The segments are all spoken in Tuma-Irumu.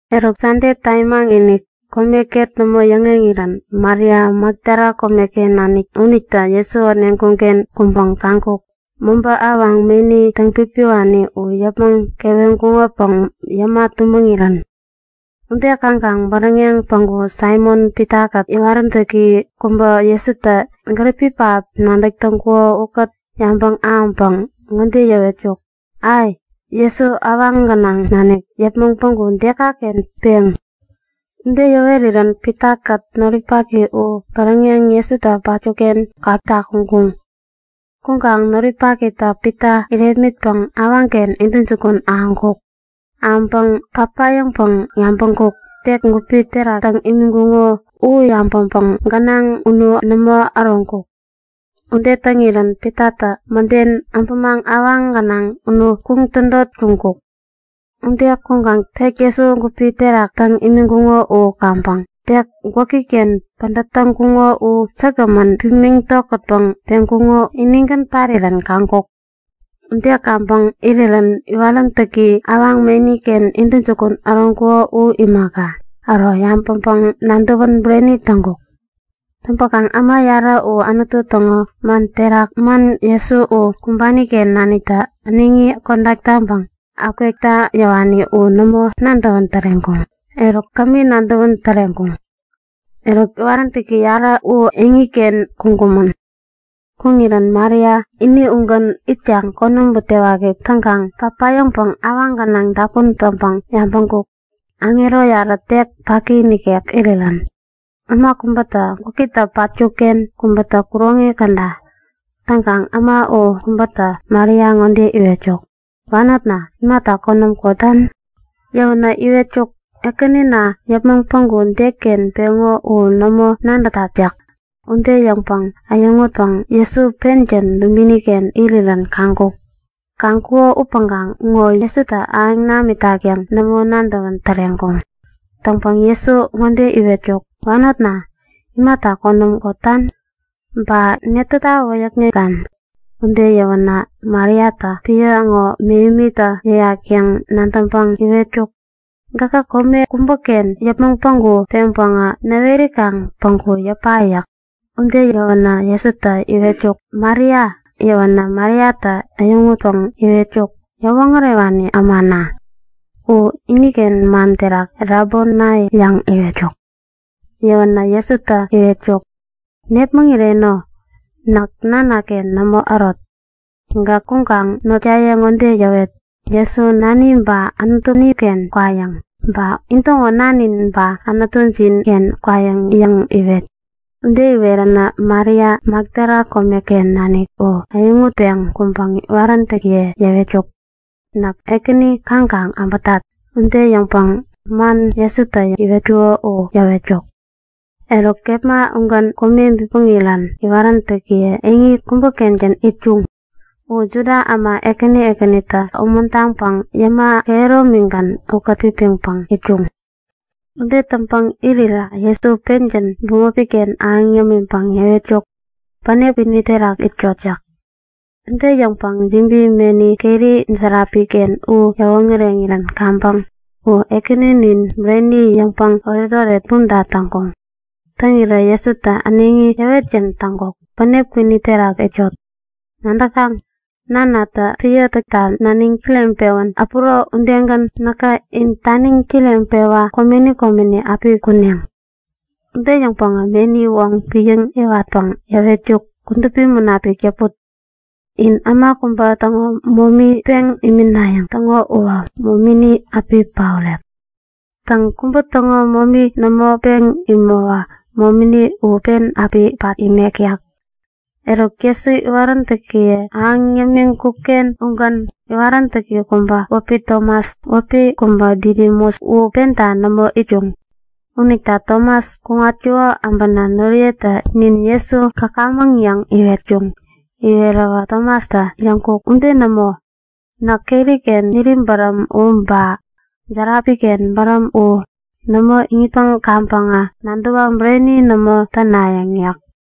Eruk Sande tamimaŋ-inik, kome ket nämo yäŋeŋirän Maria, Makdala komeken nanik unitä Jesu äneŋkuŋ-ken kuŋpäŋ kaŋkuk; Mobä awaŋ meni täŋpipiwani u yäpmäŋ keweŋkuŋopäŋ yäma tumäŋirän. Ude kaŋkaŋ bäräŋeŋ päŋku Saimon-Pitakät iwaräntäki kubä Jesutä gäripi pähap nadäk täŋkuko ukät yabäŋ ahäŋpäŋ ŋode yäwetkuk; Ai! Jesu awaŋ gänaŋ nanik yäpmäŋ päŋku dekaken peŋ? Ude yäwerirän Pitakät noripaki u bäräŋeŋ Jesutä patkuk-ken kakta kuŋkumän. Kuŋkaŋ noripakitä Pita irepmitpäŋ awaŋken intäjukun ahäŋkuk. Ahäŋpäŋä papayäŋpäŋ yabäŋkuk; Tek gupi terak täŋ imiŋkuŋo u yabäŋpäŋ gänaŋ unu nämo äroŋkuk. Ude täŋirän Pitatä mäden äbämaŋ awaŋ gänaŋ unu kuŋ tädot kuŋkuk. Ude kuŋkaŋ tek Jesu gupi terak täŋ imiŋkuŋo u kaŋpäŋ tek gwäki-ken pädät täŋkuŋo u säkgämän pimiŋ tokätpäŋ peŋkuko inigän parirän kaŋkuk. Ude kaŋpäŋ irirän iwaräntäki awaŋ meni-ken intäjukun ahäŋkuko u imaka, äro yabäŋpäŋ-nadäwän bureni täŋkuŋ. Täŋpäkaŋ äma yarä u Anutu täŋo man terak man Jesu u kumbani-ken naniktä äneŋi kodak taŋpäŋ akwekta yäwani u nämo nadäwän täreŋkuŋ. Eruk kämi, nadäwän täreŋkuŋ. Eruk, iwaräntäki yarä u eŋiken kuŋkumän. Kuŋirän Maria ini ugän itkaŋ konäm butewaki täŋkaŋ papayäŋpäŋ awaŋ gänaŋ dapun täŋpäŋ yabäŋkuk; Aŋero yarä tek paki nikek irirän. Äma kubätä gwäkitä patkuk-ken, kubätä kuroŋi käda. Täŋkaŋ äma u kubätä Maria ŋode iwetkuk; Wanotna, imata konäm kotan? Yäwänä iwetkuk; Ekänina yäpmäŋ päŋku deken peŋo u nämo nadätat yäk. Ude yäŋpäŋ äyäŋutpäŋ Jesu pengän dubini-ken irirän kaŋkuk. Kaŋkuko upäŋkaŋ ŋo Jesutä ahäŋ namitak yäŋ nämo nadäwän täreŋkuŋ. Täŋpäŋ Jesutä ŋode iwetkuk; Wanotna, imata konäm kotan? Ba netäta wäyäkŋetan? Ude yäwänä Mariatä epän ŋo mähemitä yäyak yäŋ nadäŋpäŋ iwetkuk; Gäkä kome kubäken yäpmäŋ päŋku peŋpäŋä näwerikaŋ päŋku yäpa yäk. Ude yäwänä Jesutä iwetkuk; Maria! Yäwänä Mariatä äyäŋutpäŋ iwetkuk; Yäwoŋärewani ämana! (U iniken man terak Rabonai yäŋ iwetkuk.) Yäwänä Jesutä iwetkuk; Nepmäŋireno, näk Nanaken nämo ärot. Gäk kuŋkaŋ notnaye ŋode yäwet; Jesu Nani ba Anutuni-ken kwayäŋ. Ba intäŋo Nanjin ba Anutujin-ken kwayäŋ yäŋ yäwet. Ude iweränä Maria, Makdala komeken nanik u äyäŋutpeŋ kuŋpäŋ iwaräntäkiye yäwetkuk; Näk Ekäni kaŋkaŋ äbätat! Ude yäŋpäŋ man Jesutä iwetkuko u yäwetkuk. Eruk kepma ugän kome bipmäŋirän iwaräntäkiye eŋi kubä-kengän itkuŋ. U Juda äma ekäni ekänita umuntaŋpäŋ yäma kehäromigän ukät-pipiŋpäŋ itkuŋ. Ude täŋpäŋ irirä Jesu pengän bämopi-ken ahäŋ yämiŋpäŋ yäwetkuk; Bänep kwini terak itkot! yäk. Ude yäŋpäŋ jibi meni keri järapi-ken u yäwoŋäreŋirän kaŋpäŋ U Ekäninin bureni yäŋpäŋ oretoret bumta täŋkuŋ. Täŋirä Jesutä äneŋi yäwetgän täŋkuk; Bänep kwini terak itkot! Nadäkaŋ? Nanatä epän täkta naniŋ kireŋpewän äpuro udegän näkä in taniŋ kireŋpewa komeni komeni api kuneŋ. Ude yäŋpäŋä meni woŋ piäŋ-yäwatpäŋ yäwetkuk; Kudupi Munapik yäput! In äma kubä täŋo momi peŋ iminayäŋ täŋo uwä momini api paorek. Täŋ, kubä täŋo momi nämo peŋ imäwä momini u pen api pat imek yäk. Eruk Jesu iwaräntäkiye ahäŋ yämiŋkuk-ken ugän iwaräntäki kubä wäpi Tomas (wäpi kubä Didimus) u penta nämo itkuŋ. Unita Tomas kuŋatkuko äbänä noriyetä nin Jesu käkamäŋ yäŋ iwetkuŋ. Iweräwä Tomastä yäŋkuk; Ude nämo! Näk keri-ken niri bäräm u ba järapi-ken bäräm u nämo iŋitpäŋ kaŋpäŋä nadäwa bureni nämo tänayäŋ yäk.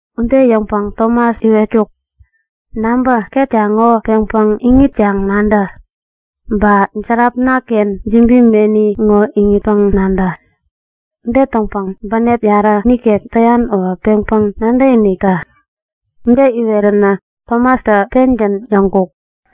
Ude yäŋpäŋ Tomas iwetkuk; Nabä! Ketka ŋo peŋpäŋ iŋitkaŋ nadä. Ba järapna-ken jibi meni ŋo iŋitpäŋ-nadä. Ude täŋpäŋ bänep yarä nikek täyan uwä peŋpäŋ nadäkinik tä. Ude iweränä Tomastä pengän yäŋkuk;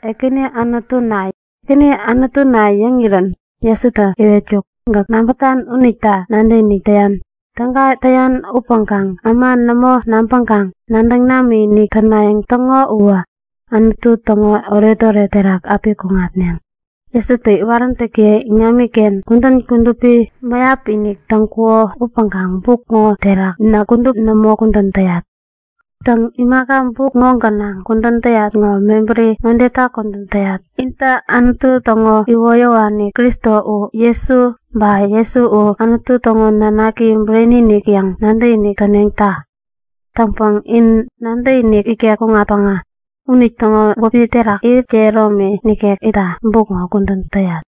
Ekäni Anutuna! Ekäni Anutuna yäŋ yäŋirän Jesutä iwetkuk; Gäk nabätan unita nadäkinik täyan. Täga täyan upäŋkaŋ äma nämo nabäŋkaŋ nadäŋ namikinik tänayäŋ täŋo uwä Anutu täŋo oretoret terak api kuŋatneŋ. Täŋpäkaŋ Jesutä iwaräntäkiye iŋamiken kudän kudupi mäyap-inik täŋkuko upäŋkaŋ buk ŋo terak näk kudup nämo kudän täyat. Täŋ, imaka buk ŋo gänaŋ kudän täyat ŋo mebäri ŋodeta kudän täyat; Intä Anutu täŋo iwoyäwani Kristo u Jesu, ba Jesu u Anutu täŋo nanaki bureni-inik yäŋ nadäkinik täneŋta. Täŋpäŋ in nadäkinik ikek kuŋatpäŋä unitäŋo wäpi terak irit kehäromi nikek itta buk ŋo kudän täyat.